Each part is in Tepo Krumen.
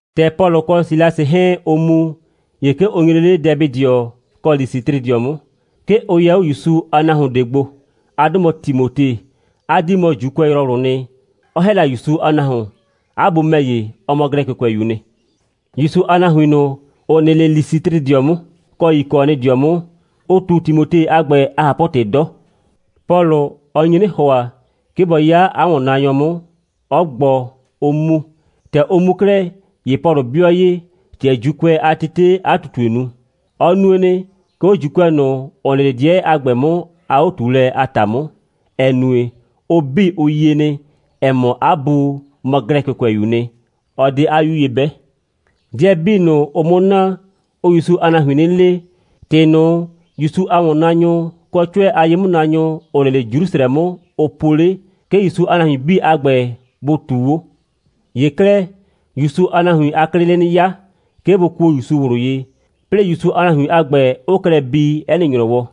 ‑Tɛ Pɔlʋ kɔ Silasɩ 'hɛɛn, ʋʋ mu, ‑ye 'ke ʋ nyre 'le Dɛbɩdɩɔ kɔ Lisɩtrɩdɩɔ 'mʋ. 'Ke ʋ yɛ 'o ‑Yusu a nahuon ꞊de gbo. 'A 'dʋ mɔ Timote. 'A 'dii mɔ ‑Juukʋɛyrɔwlʋʋ nɩ, 'ɔ ‑hɛ la ‑Yusu a nahuon. 'A bu ‑mɛ ‑ye, ɔ mɔ Glɛkɩkʋɛyu'u nɩ. ‑Yusu a nahuin ꞊nʋ, ‑ʋ nɩ 'le Lisɩtrɩdɩɔ 'mʋ, kɔ Yikɔnɩdɩɔ 'mʋ, ʋ ꞊tu Timote a ‑gbɛ a ꞊hapʋ‑tɩ 'dɔ. Pɔlʋ, ɔ nye 'nɩ ‑hʋa, 'ke bɔ 'ya 'a ‑wɔnnaanyɔ 'mʋ, 'ɔ gbɔ, 'ʋ mu. ‑Tɛ ʋ mu 'klɛɛ, ‑ye Pɔlʋ 'bɩɔ ye, ‑tɛ ‑Juukʋɛ a tetee 'a ꞊tutue nu. Ɔ nue nɩ, 'ke 'o ‑Juukʋɛ ꞊nʋ, ‑ʋ nɩ 'le 'dɩɛ a ‑gbɛ 'mʋ a 'o꞊tuulɛ a ‑ta 'mʋ, ‑ɛ nue, ʋ 'bii, ʋ yie nɩ, ‑ɛ mɔ, 'a bu mɔ Glɛkɩkʋɛyu'u nɩ, 'ɔ 'de 'a 'yu ye 'bɛ. 'Dɩɛ 'bii ꞊nʋ, ʋʋ 'mʋ na, ʋʋ ‑Yusu a nahuin 'nɩ le, ‑tɩ ꞊nʋ, ‑Yusu a ‑wɔnnaanyʋ, kɔ 'cʋɛ a ye'mʋnaanyʋ, ‑ʋ nɩ 'le Jrusrɛ 'mʋ, ʋ po 'le, 'ke ‑Yusu a nahuin 'bii a ‑gbɛ bʋ ꞊tuu 'o. ‑Ye 'klɛɛ, ‑Yusu a nahuin a 'klɩɩ 'le 'nɩ 'ya, 'ke bʋ kuo ‑Yusu ꞊wlʋ ye, 'plɩɩ ‑Yusu a nahuin a ‑gbɛ 'ʋʋ klɛ bii 'ɛ nɩ ‑nyrɔwɔ.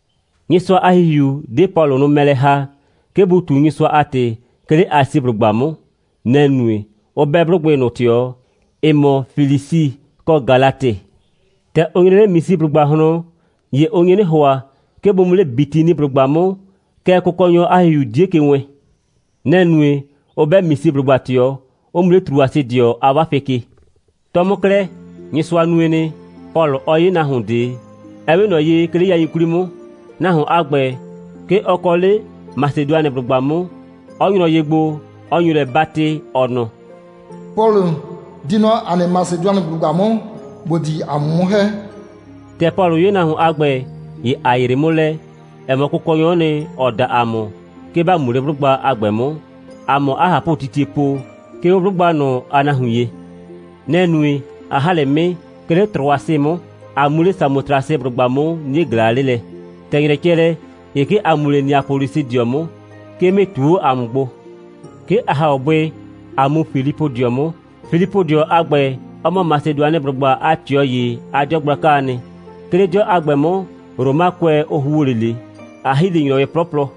Nyɩsʋa a ‑Hihiu 'de Pɔlʋ nʋ mɛ lɛ ‑ha, 'ke bʋ ꞊tu Nyɩsʋa a ‑tɩ, 'ke 'le Asiblʋgba 'mʋ. Nɛ‑ nue, 'ʋ 'bɛ 'blʋgbɩ ꞊nʋ ꞊tɩɔ, ‑ɩ mɔ Flisi kɔ Galatɩ. ‑Tɛ ʋ nyre 'le Misiblʋgba ꞊hlɔn, ‑ye ʋ nye 'nɩ ‑hʋa, 'ke bʋ mu 'le Bitiniblʋgba 'mʋ, kɛɛ, Kʋkɔnyɔ a ‑Hihiu 'die ke wɛɛn. Nɛ‑ nue, 'ʋ 'bɛ Misiblʋgba ꞊tɩɔ, 'ʋ mu 'le Trʋasɩdɩɔ a 'wafɩ ke. 'Tɔ 'mʋ 'klɛɛ, Nyɩsʋa nue nɩ, Pɔlʋ 'ɔ 'ye nahuon ꞊de, ‑ɛ 'we ꞊nɔ ye, 'ke 'le yain 'kwli 'mʋ. Nahuon a ‑gbɛ, 'ke ɔ kɔ 'le Masedʋanɩblʋgba 'mʋ, 'ɔ nyrɔ ye gbo, 'ɔ nyo lɛ 'batɩ, ɔ nɔ: «Pɔlʋ, di nɔ ‑a nɩ Masedʋanɩblʋgba 'mʋ, ‑bo di ‑a mʋ 'mʋ ‑hɛ!» ‑Tɛ Pɔlʋ 'ye nahuon a ‑gbɛ, ‑ye ‑a yree 'mʋ lɛ, ‑ɛ mɔ, Kʋkɔnyɔ'ɔ nɩ, ‑ɔ da ‑a mʋ, 'ke ‑ba mu 'le 'blʋgba a ‑gbɛ 'mʋ, ‑a 'mʋ 'a ꞊hapʋtitie po, 'ke 'o 'blʋgba ꞊nʋ a nahuin ye. Nɛ‑ nue, ꞊a ‑ha 'le 'mɩɩ, 'ke 'le Trʋasɩ 'mʋ, ꞊a mu 'le Samotrasɩblʋgba 'mʋ, 'nie ꞊glaa 'le lɛ. ‑Tɛ ‑nyrɛ cɛ lɛ, ‑ye 'ke ‑a mu 'le Neapolisɩdɩɔ 'mʋ. 'Ke 'mɩɩ ꞊tu 'o ‑a mʋ gbo. 'Ke ‑a ‑ha 'o bʋɩ, ꞊a mu Filipʋdɩɔ 'mʋ. Filipʋdɩɔ a ‑gbɛ, ɔ mɔ Masedʋanɩblʋgba a ꞊tɩɔ ‑ye a 'dɩɔ gblakaa nɩ. 'Ke 'le 'dɩɔ a ‑gbɛ 'mʋ, Romakʋɛ, ʋ ‑huo 'le ꞊le. ‑A ‑hi 'le ‑nyrɔwɩ 'plɔplɔ.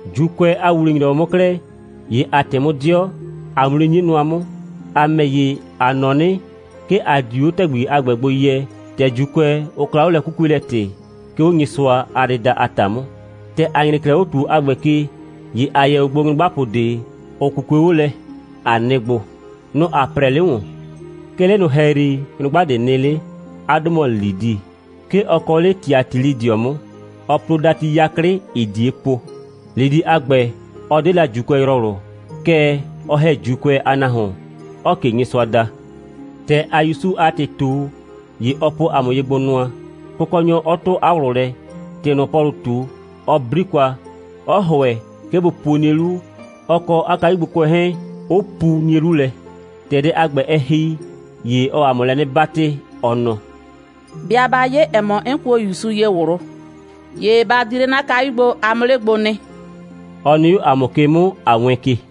‑Juukʋɛ a ‑wuwle‑nyrɔwɔ 'mʋ 'klɛɛ, ‑ye ‑a ꞊tɩ 'mʋ 'dɩɔ, ꞊a mu 'le 'nie nʋa 'mʋ. ‑A ‑mɛ ‑ye, ‑a nɔ 'nɩ, 'ke ‑a di 'o ‑tɛgbi ꞊nʋ gbo yɛ, ‑tɛ ‑Juukʋɛ, ʋ kla 'o lɛ'kukuelɛ‑tɩ, 'ke 'o Nyɩsʋa a dɩda a ‑ta 'mʋ. ‑Tɛ ‑a nyre 'klɛɛ 'o ‑tuo a ‑gbɛ ke, ‑ye ‑a yɛ 'o gbo nyrʋgbapʋ ꞊de, ‑ʋ 'kukue 'o lɛ, ꞊a nɩ gbo. Nʋ‑ ‑a 'prɛɛ 'le ‑wɔn. 'Ke 'le ꞊nʋ ‑hɛyri, nyrʋgba ꞊de nɩ 'le. 'A 'dʋ mɔ Lidi. 'Ke ɔ kɔ 'le Tiatilɩdɩɔ 'mʋ. Ɔɔ plo dati 'yaklɩ, ‑ɩɩ ꞊die po. Lidi a ‑gbɛ, ɔ 'de la ‑Juukʋɛyrɔwlʋ, kɛɛ, ɔ ‑hɛ ‑Juukʋɛ a nahuon, 'ɔɔ ꞊ke Nyɩsʋa da. ‑Tɛ ‑aa ‑Yusu a ‑tɩ ꞊tu, ‑ye ɔ po ‑a mʋ ye gbo nʋa, Kʋkɔnyɔ 'ɔ 'tʋ 'a ꞊wlʋ lɛ, ‑tɩ ꞊nʋ, Pɔlʋʋ ꞊tu, 'ɔ 'bli kwa, 'ɔ ‑hʋɛ, 'ke bʋ puo 'nie 'lu, ɔ kɔ 'a kayugbokʋɛ 'hɛɛn, 'ʋ pu 'nie 'lu lɛ. ‑Tɛ dɛ a ‑gbɛ, ɛ ‑hi, ‑ye ɔɔ ‑a mʋ lɛ 'nɩ 'batɩ, ɔ nɔ: «'Bɩa 'ba 'ye, ‑ɛ mɔ, 'n kuo Kʋkɔnyɔ ‑Yusu ye ꞊wlʋ, ‑ye ba di 'le 'na kayu gbo, a 'mʋ 'le gbo nɩ,» 'ɔ nɩ 'o ‑a mʋ ke 'mʋ, ꞊a wɛɛn ke.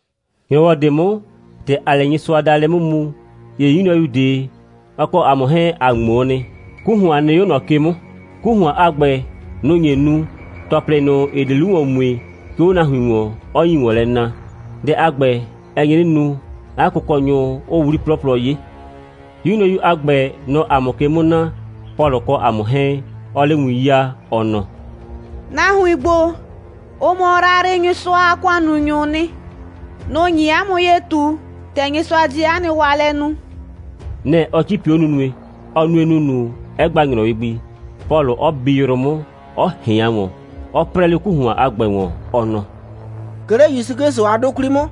‑Nyrɔwɔ ꞊de 'mʋ, ‑tɛ ‑aa 'le Nyɩsʋadaalɛ 'mʋ mu, ‑ye 'yu nyrɔyu ꞊de, ɔ kɔ ‑a mʋ 'hɛɛn, ‑a ꞊ŋmoo nɩ. 'Ku ‑hʋan nɩ 'o ꞊nɔ ke 'mʋ. 'Ku ‑hʋan a ‑gbɛ, nʋ‑ nye nu, ‑tɔplɩ ꞊nʋ, ‑ɩ di 'lu ‑wɔn mue, 'ke 'o nahuin ‑wɔn, 'ɔ nyi ‑wɔn lɛ na. Dɛ a ‑gbɛ, ɛ nye 'nɩ nu, 'a kʋkɔnyʋ 'ʋʋ 'wli 'plɔplɔ 'ye. 'Yu nyrɔyu a ‑gbɛ, nɔ‑ɔ ‑a mʋ ke 'mʋ na, Pɔlʋ kɔ ‑a mʋ 'hɛɛn, 'ɔɔ 'le win 'yaa, ɔ nɔ: «Nahuin ‑gbo, ʋ mɔ Yrayrɩnyɩsʋa a ‑kʋannunyʋʋ nɩ. Nʋ‑ nyi 'a mʋ ye ꞊tu, ‑tɛ Nyɩsʋa di 'a nɩ waalɛ nu.» Nɛ‑ ɔ 'cipi 'o nunue. Ɔ nue ‑nunu, 'ɛ gba ‑nyrɔwɩ gbi, Pɔlʋ 'ɔ bi yrʋ 'mʋ, 'ɔ ꞊hɩan ‑wɔn, 'ɔ 'prɛɛ 'le 'ku ‑hʋan a ‑gbɛ ‑wɔn, ɔ nɔ: «'Ke 'le ‑Yusu 'Klɩsʋ a 'dʋ 'kwli 'mʋ,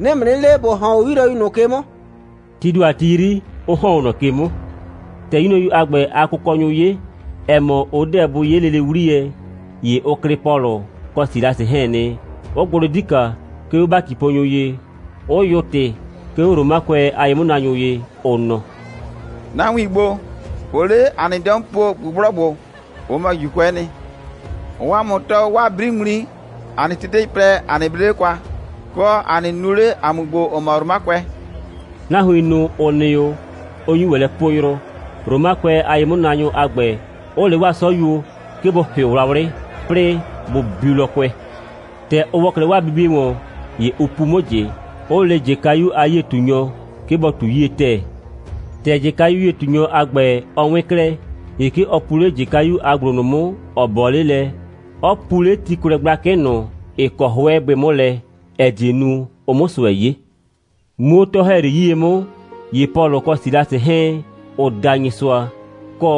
'nɩɩ ‑mʋ 'nɩ le, ‑bo ‑hɔn 'o 'yu nyrɔyu ꞊nʋ ke 'mʋ,» tii ‑do a ti 'yri, 'ʋ ‑hɔn 'o ꞊nɔ ke 'mʋ. ‑Tɛ 'yu nyrɔyu a ‑gbɛ a kʋkɔnyʋ 'ye, ‑ɛ mɔ, ʋ 'deɛ bʋ 'ye lele 'wliyɛ, ‑ye ʋ klɩ Pɔlʋ kɔ Silasɩ 'hɛɛn nɩ, 'ʋ gbʋ 'le 'dika, 'ke 'o ‑batiponyʋ ye, 'ʋ yʋʋ ‑tɩ, 'ke 'o Romakʋɛ a ye'mʋnaanyʋ ye, ʋ nɔ: «Nahuin ‑gbo, ʋʋ 'le ‑a nɩ 'dɩɔ 'mʋ po ꞊gbʋgblɔgbʋ. Ʋ mɔ ‑Juukʋɛ'ɛ nɩ. Ʋʋ ‑a mʋ tɔɔ 'waa 'briŋmli, ‑a nɩ tetei plɛ, ‑a nɩ 'ble 'le kwa, kɔ, ‑a nɩ nu 'le, ‑a mʋ ‑gbo, ‑ʋ mɔ Romakʋɛ.» Nahuin ꞊nʋ, ‑ʋ nɩ 'o, ʋ nyu ‑wɛ lɛ poo yrʋ, Romakʋɛ a ye'mʋnaanyʋ a ‑gbɛ, 'ʋ le 'waa 'sɔyuo, 'ke bʋ ‑hɩʋ wlawlɩ, 'plɩɩ bʋ biu lɔkʋɛ. ‑Tɛ ʋ ‑wɔ 'klɛɛ 'waa bibie ‑wɔn, ‑ye ʋ pu 'mʋ ꞊jɩ, 'ʋ le ꞊jɩkayu a 'yie꞊tunyɔ, 'ke bɔ ꞊tu 'yie ‑tɛɛ. ‑Tɛ ꞊jɩkayu a 'yie꞊tunyɔ a ‑gbɛ, ɔ 'wɩn 'klɛɛ, ‑ye 'ke ɔ pu 'le ꞊jɩkayu a ‑gblo ꞊nʋ 'mʋ, ‑ɔ 'bɔɔ 'le lɛ, 'ɔ pu 'le tikwlɛ gblakɩ ꞊nʋ, ‑ɩ kɔ 'hʋɛ bʋɩ 'mʋ lɛ, ‑ɛ die nu, ʋ 'mʋ ꞊sʋɛ 'ye. Muu 'o 'tɔ‑hɛyri 'yie 'mʋ, ‑ye Pɔlʋ kɔ Silasɩ 'hɛɛn, ʋʋ da Nyɩsʋa, kɔ,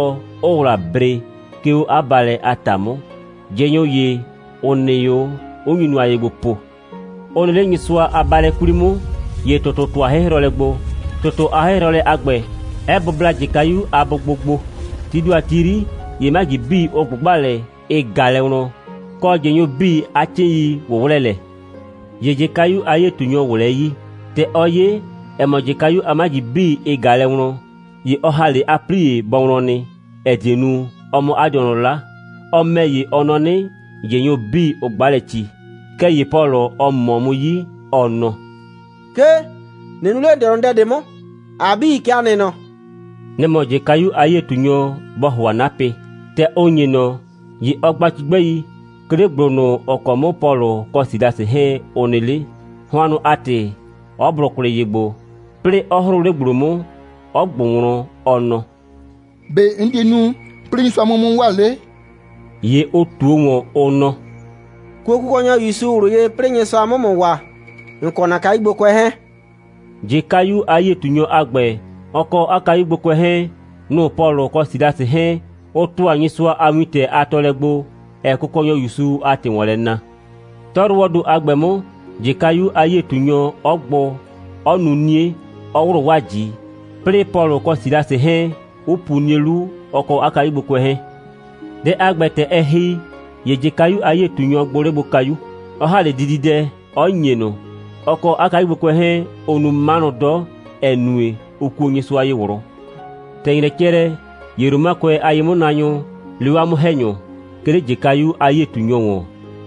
'ʋʋ ‑wla bre, 'ke 'o 'a baalɛ a ‑ta 'mʋ, ꞊jɩnyʋ ‑ye, ‑ʋ nɩ 'o, 'ʋ nyu nʋa ye gbo po. Ʋ nɩ 'le Nyɩsʋa a baalɛ 'kwli 'mʋ, ‑ye ‑tʋtʋ ‑tʋa 'hɩhrɔlɛ gbo, ‑tʋtʋ a 'hɩhrɔlɛ a ‑gbɛ, 'ɛ bʋbla ꞊jɩkayu a bʋgbo gbo. Tii ‑do a ti 'yri, ‑ye 'maji 'bii, ʋ ꞊gbʋgba lɛ, ɩ ꞊ga lɛ wlɔn, kɔ, ꞊jɩnyʋ 'bii a 'cɩɩn.i ꞊wʋwlɛɛ lɛ. ‑Ye ꞊jɩkayu a 'yie꞊tunyɔ ꞊wlɛɛ 'yii. ‑Tɛ ɔ 'ye, ‑ɛ mɔ, ꞊jɩkayu a 'maji 'bii, ɩ ꞊ga lɛ wlɔn, ‑ye ɔ ‑ha 'le 'a 'plie bɔ wlɔn nɩ, ‑ɛ die nu, ɔ 'mʋ 'a dɩɔnʋ 'la. Ɔ ‑mɛ ‑ye, ɔ nɔ 'nɩ, ꞊jɩnyʋ 'bii, ʋ 'gba lɛ ci. Kɛɛ ‑ye Pɔlʋ, ɔ ꞊mɔɔ 'mʋ 'yi, ɔ nɔ: «'Kee, ꞊nɩ nu 'le ‑n dɩɔnʋ dɛ ꞊de 'mʋ, ‑a 'bii, kɛ ‑a nɩ nɔ.» Nɛ‑ mɔ ꞊jɩkayu a 'yie꞊tunyɔ, bɔ ‑hʋa 'napɩ. ‑Tɛ ʋ ‑nye ꞊nɔ, ‑ye ɔ gba cigbɛi, 'ke 'le ‑gblo ꞊nʋ, ‑ɔ kɔ 'mʋ Pɔlʋ kɔ Silasɩ 'hɛɛn, ʋ nɩ 'le, hʋannʋ a ‑tɩ, 'ɔ blʋ kwlɩ ye gbo, 'plɩɩ 'ɔ 'hrʋʋ 'le ‑gblo 'mʋ, 'ɔ ꞊gbʋ wlɔn, ɔ nɔ: «‑Be' 'n di nu, 'plɩɩ Nyɩsʋa 'mʋ 'mʋ waa 'le?» ‑Ye ʋ ꞊tuo ‑wɔn, ʋ nɔ: «Kuo Kʋkɔnyɔ ‑Yusu ꞊wlʋ ye, 'plɩɩ Nyɩsʋa 'mʋ ‑mʋ waa, ‑n kɔ ‑na kayugbokʋɛ 'hɛɛn,» ꞊jɩkayu a 'yie꞊tunyɔ a ‑gbɛ, ɔ kɔ 'a kayugbokʋɛ 'hɛɛn, nʋ‑ Pɔlʋ kɔ Silasɩ 'hɛɛn, ʋ ‑tʋa Nyɩsʋa a wintɛ a tɔɔlɛ gbo, ‑ɛɛ Kʋkɔnyɔ ‑Yusu a ‑tɩ ‑wɔn lɛ na. 'Tɔyrʋwɔɔ ‑do a ‑gbɛ 'mʋ, ꞊jɩkayu a 'yie꞊tunyɔ 'ɔ gbʋ, 'ɔ nu 'nie, 'ɔ ‑wlʋ 'waa ꞊ji, 'plɩɩ Pɔlʋ kɔ Silasɩ 'hɛɛn 'ʋ puo 'nie 'lu, ɔ kɔ 'a kayugbokʋɛ 'hɛɛn. Dɛ a ‑gbɛ, ‑tɛ ɛ ‑hi, ‑ye ꞊jɩkayu a 'yie꞊tunyɔ gbʋ 'le gbo kayu, 'ɔ ‑ha 'le dididɛ, 'ɔ ‑nye ꞊nʋ. Ɔ kɔ 'a kayugbokʋɛ 'hɛɛn, ʋʋ nu 'manʋ 'dɔ, ‑ɛ nue, ʋ kuo Nyɩsʋa ye ꞊wlʋ. ‑Tɛ ‑nyrɛ cɛ lɛ, ‑ye Romakʋɛ a ye'mʋnaanyʋ lee 'waa 'mʋ‑hɛnyʋ, 'ke 'le ꞊jɩkayu a 'yie꞊tunyɔ ‑wɔn,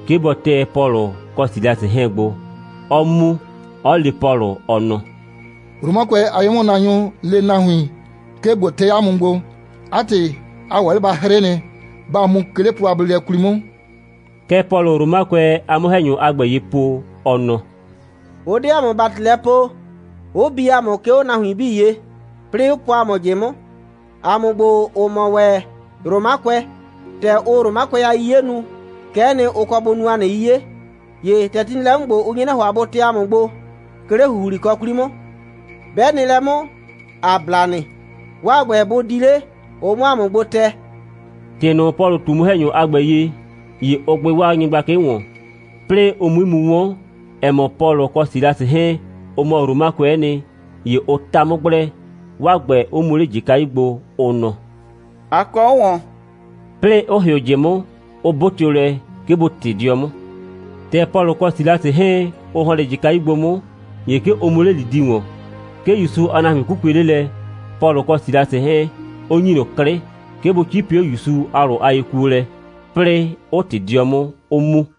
'ke bɔ tɛ Pɔlʋ kɔ Silasɩ 'hɛɛn gbo, 'ɔ mu, 'ɔ le Pɔlʋ, ɔ nɔ: «Romakʋɛ a ye'mʋnaanyʋ le nahuin, 'ke ꞊bo tɛ 'a mʋ gbo. 'A ‑tɩ, a ‑wɛ 'le ba 'hrɩ nɩ. Ba mu, 'ke 'le plɔ a bleelɛ 'kwli 'mʋ.» Kɛ Pɔlʋʋ Romakʋɛ a 'mʋ‑hɛnyʋ a ‑gbɛ ye po, ɔ nɔ: «Ʋ 'de ‑a mʋ ‑bati lɛ poo, 'ʋ bi ‑a mʋ, 'ke 'o nahuin 'bii ye, 'plɩɩ 'ʋ po ‑a mʋ ꞊jɩ 'mʋ, ‑a mʋ ‑gbo, ‑ʋ mɔ ‑wɛ Romakʋɛ. ‑Tɛ ʋʋ Romakʋɛ a 'yiye nu, kɛ'ɛ nɩ, ʋ kɔ bʋ nu ‑a nɩ 'yiye. ‑Ye ‑tɛ ti nɩ lɛ 'mʋ ‑gbo, ʋ nye 'nɩ ‑hʋa, bʋ tɛ ‑a mʋ gbo, 'ke 'le ‑huhlikɔ 'kwli 'mʋ. 'Bɛ nɩ lɛ 'mʋ, ‑a bla nɩ. 'Waa ‑gbɛ, bʋ di 'le, ʋ 'mʋ ‑a mʋ gbo tɛ.» ‑Tɩ ꞊nʋ, Pɔlʋ ꞊tu 'mʋ‑hɛnyʋ a ‑gbɛ ye, ‑ye ʋ gbɩ 'waa nyɩgblakɩ ‑wɔn. 'Plɩɩ ʋ 'mui mu 'wɔn, ‑ɛ mɔ, Pɔlʋ kɔ Silasɩ 'hɛɛn, ʋ mɔ Romakʋɛ'ɛ nɩ, ‑ye ʋ ta 'mʋ gblɛ, 'waa ‑gbɛ, 'ʋ mu 'le ꞊jɩkayu gbo, ʋ nɔ: «A kɔ 'o ꞊wɔn,» 'plɩɩ 'ʋ ‑hɩʋ ꞊jɩ 'mʋ, 'ʋ 'bʋtɩʋ lɛ, 'ke bʋ ꞊tɩ 'dɩɔ 'mʋ. ‑Tɛ Pɔlʋ kɔ Silasɩ 'hɛɛn, ʋ ‑hɔn 'le ꞊jɩkayu gbo 'mʋ, ‑ye 'ke ʋ mu 'le Lidi ‑wɔn. 'Ke ‑Yusu a nahuin 'kukue 'le lɛ, Pɔlʋ kɔ Silasɩ 'hɛɛn, 'ʋ ‑nyi ꞊nʋ 'klɩ, 'ke bʋ 'cipi 'o ‑Yusu a ꞊wlʋ a yekuolɛ, 'plɩɩ 'ʋ ꞊tɩ 'dɩɔ 'mʋ, 'ʋ mu.